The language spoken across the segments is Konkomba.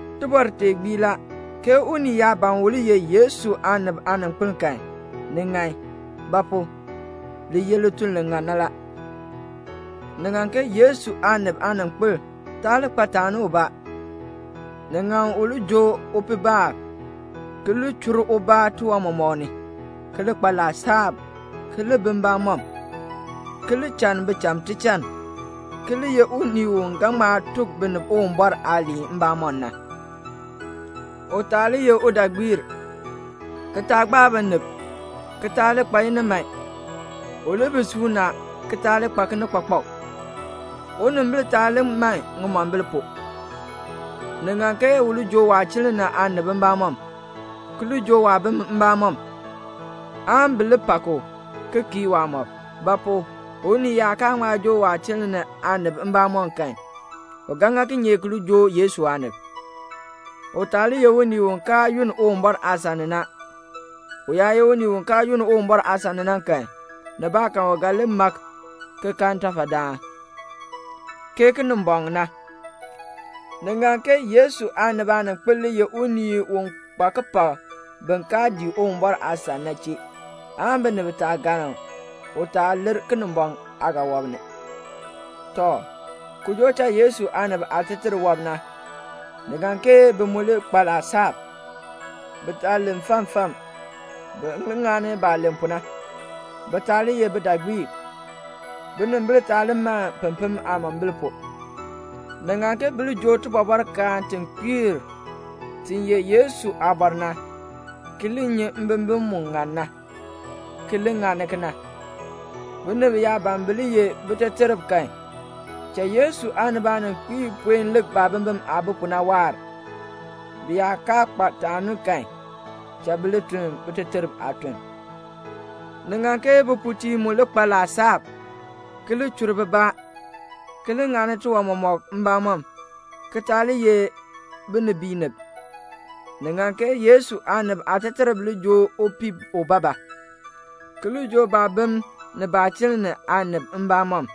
Tibɔr tee gbii la, ke unii yaa ban u li ye Yesu aanib aaninkpil kan, ni ŋan; ba pu? li ye lituln li ŋan na la. Ni ŋan ke Yesu aanib aaninkpil taa li kpa taani ubaa. Ni ŋan u li joo upiibaab, ki li chur ubaa tiwan mɔmɔk ni, ki li kpa laasab, ki li bi mbamɔm, ki li channi bicham tichann, ki li ye unii u ga ŋma tuk binib Uwumbɔr aaliin mbamɔm na. U taa li ye udaagbiir, ki taa gbaa binib [ki taa li kpa iniman]. U li bi suuna ki taa li kpa kinikpakpak. Unimbil taa li man ŋimombil pu. Ni ŋan ke u li joo waachiln ni aanib mbamɔm, ki li joo waabim mbamɔm, aan bi li pak u ki kii waamɔb. Ba pu? unii yaa kaa ŋma joo waachiln ni aanib mbamɔm kan, u ga ŋa kinye ki li joo Yesu aanib? U taa li ye unii u kaa yunn Uwumbɔr aasan ni na. U yaa ye unii u kaa yunn Uwumbɔr aasan ni na kan, nibaakan u ga li mak, ki kan ntafadaan, ke Kinimbɔŋ na. Ni ŋan ke Yesu aanib aaninkpil li ye unii u kpa kipak bin kaa dii Uwumbɔr aasan na chee, aan binib taa galn u, u taa lir Kinimbɔŋ aagaawɔb ni. Tɔ, joo cha Yesu aanib aateterb, ni ŋan ke bi mu li kpa laasab. Bi taa len fam fam. Bi li ŋani baah len pu na. Bi taa li ye bidaagbiib. Binimbil taa li man pempem aamombil pu. Ni ŋan ke bi li joo tibɔbɔrkaan ti kpiir, ti ye Yesu aabɔr na, ki li nyi mbimbin mu ŋan na, ki li ŋani kena. Binib yaa ban bi li ye biteterb kan, cha Yesu aanib aaninkpiib puen lik baabimbin aah bi pu na waahr, bi yaa kaa kpa taani kan, cha bi li tun biteterb aatuln. Ni ŋan ke bipuutiib mu li kpa laasab, ki li chur bibaa, ki li ŋani tiwan mɔmɔk mbamɔm, ki taa li ye binibiinib. Ni ŋan ke Yesu aanib aateterb li joo upii ubaabaa, ki li joo baabim ni baachiln ni aanib mbamɔm.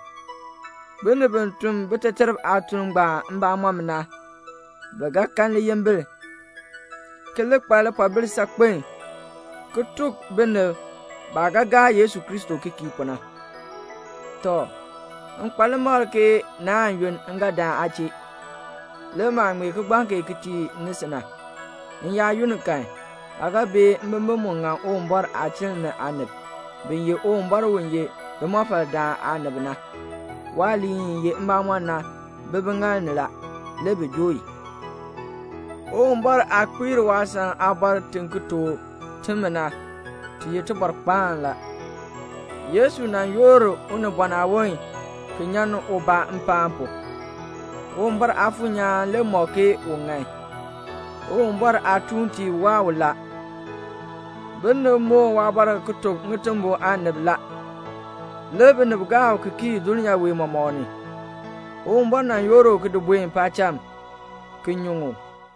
Binib bi tun biteterb aatuln ngbaan mbamɔm na, bi ga kan liyimbil, ki li kpa lipoobil saakpen ki ti tuk binib baah gaa Yesu Kristo ki kii pu na. Tɔ, m kpa limakl ke naan yunn, m ga dan aa chee. Le maah ŋmee kigbaŋ kee ki tii ni si na, m yaa yunn kan, aa ga bee mbimbin mu ŋann Uwumbɔr aachiln ni aanib, bi ye Uwumbɔr u ye limɔfaldaan na aanib na. Waaliin i ye mbamɔn na bi biŋaal ni la, le bi joo i. Uwumbɔr aah kpiir waasan aabɔr ti ki tuk timi na, ti ye tibɔrkpaan la: Yesu nan yoor unibɔn aawon, ki kpiir ubaa. Uwumbɔr Aafuur nyaan le mɔk ke u ŋan. Uwumbɔr aatuuntiib waa u la. Binib moon waabɔr ki tuk ŋitimbol aanib la, le binib gaa u ki kii dulnyaa wee mɔmɔk ni. Uwumbɔr nan yoor u ki di buen paacham, ki nyuŋ u.